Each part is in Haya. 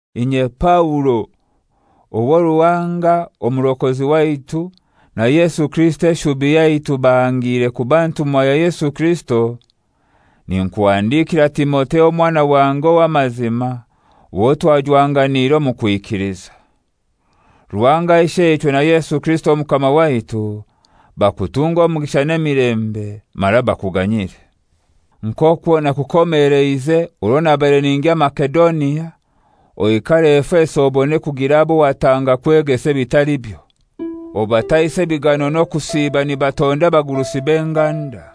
Inye Paulo, owo Ruhanga Omurokozi waitu na Yesu Kirisito eshubi yaitu bahangire kuba ntumwa ya Yesu Kirisito, ninkuhandikira Timotheo omwana wange ow'amazima owo twajwanganiire omu kwikiliza. Ruhanga Isheichwe na Yesu Kirisito Omukama waitu, bakutunge omugisha n'emilembe, mara bakuganyire. Nk'okwo nakukomeleize orwo nabaire ningya Masedonia, oikare Efeso obone kugira abo watanga kwegesa ebitalibyo. Obataise ebigano n'okusiiba nibatonda abagurusi b'enganda.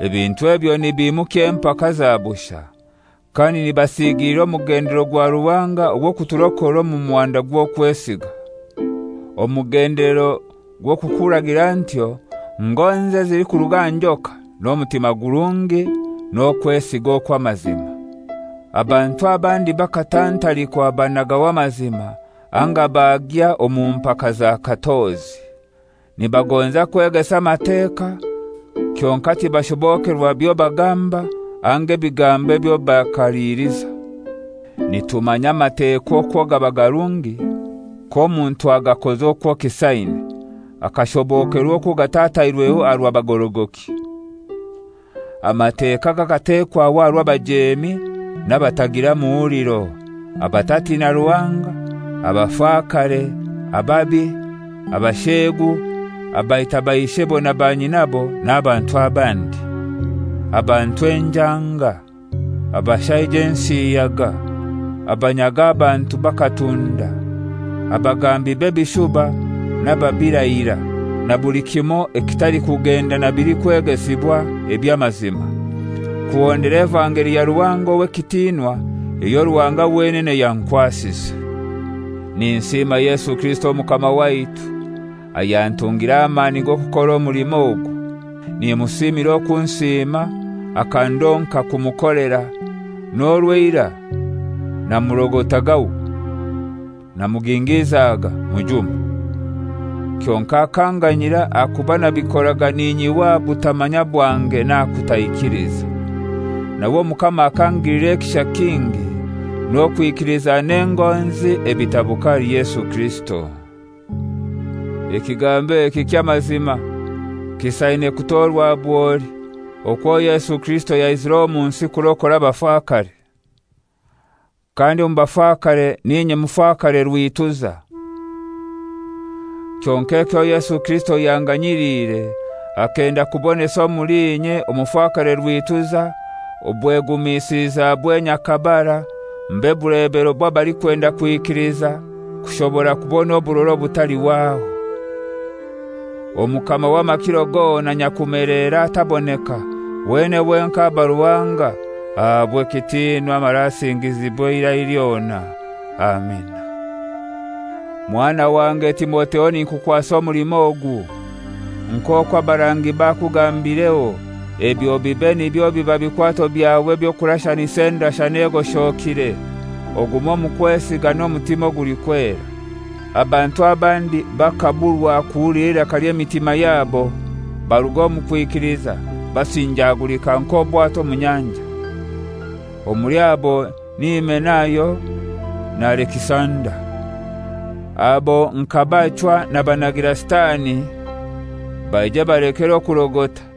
Ebintu ebyo nibimukya empaka za bushai, kandi nibasigiilira omugendelero gwa Ruhanga ogw'okuturokora omu muhanda gw'okwesiga. Omugendelero gw'okukuragira ntyo ngonzi ezilikuruga aha njoka n'omutima gurungi n'okwesiga okw'amazima. Abantu abandi bakatantalikwa banagaho amazima anga bagya omu mpaka za katozi. Nibagonza kwegesa Amateka, kyonkai tibashobokerwa byo bagamba anga anga ebigambo ebyo bakaliliza. Nitumanya Amateka okwo gaba garungi k'omuntu agakoza okwo kisaine, akashobokerwa okwo gatatairweho aha rwa bagorogoki. Amateka gakatekwaho aha rw'abajeemi n'abatagira muhuliro, abatatina Ruhanga, abafakare, ababi, abasheegu, abaita baishebo na banyinabo n'abantu abandi, abantu enjanga, abashaija ensiyaga, abanyaga abantu bakatunda, abagambi b'ebishuba n'ababirahira, na buli kimoi ekitalikugenda na bilikwegesibwa eby'amazima kuhondera evangeli ya Ruhanga ow'ekitinwa eyo Ruhanga wenene yankwasize. Ninsiima Yesu Kirisito Omukama waitu ayantungire amani g'okukora omulimo ogu. Nimusiimira okunsiima akandonka kumukolera, n'orwo eirai namurogotagaho, namugingizaga, mujuma. Kyonkai akanganyira ahakuba nabikoraga ninyihwa aha butamanya bwange n'aha kutaikiliza. Nawe Omukama akangilira ekisha kingi, n'okwikiliza n'engonzi ebitabuka ahali Yesu Kirisito. Ekigambo eki ky'amazima, kisaine kutorwa bwoli: Okwo Yesu Kirisito yaizire omu nsi kurokora abafakare. Kandi omu bafakare n'inye mufakare rwituza. Kyonkai ekyo Yesu Kirisito yanganyiliire akenda kubonesa omuli inye, omufakare rwituza, obwegumisilizabwe nyakabara, mbe bulebero bw'abalikwenda kwikiliza kushobora kubona oburora obutalihwaho. Omukama w'amakiro gona, nyakumelera, ataboneka, wenene wenkai aba Ruhanga, ahabwe ekitinwa mara asingizibwe eirai lyona. Amina. Mwana wange Timotheo, ninkukwasa omulimo ogu, nk'okwo abarangi bakugambireho, ebyo bibe nibyo biba bikwato byawe eby'okurashanisa endashana egoshokire, ogume omu kwesiga n'omutima ogulikwera. Abantu abandi bakaburwa kuhulira eiraka ly'emitima yabo, baruga omu kwikiliza, basinjagulika nk'obwato omu nyanja. Omuli abo ni Himenayo na Alekisanda. Abo nkabachwa nabanagira Sitani, baije balekere okurogota.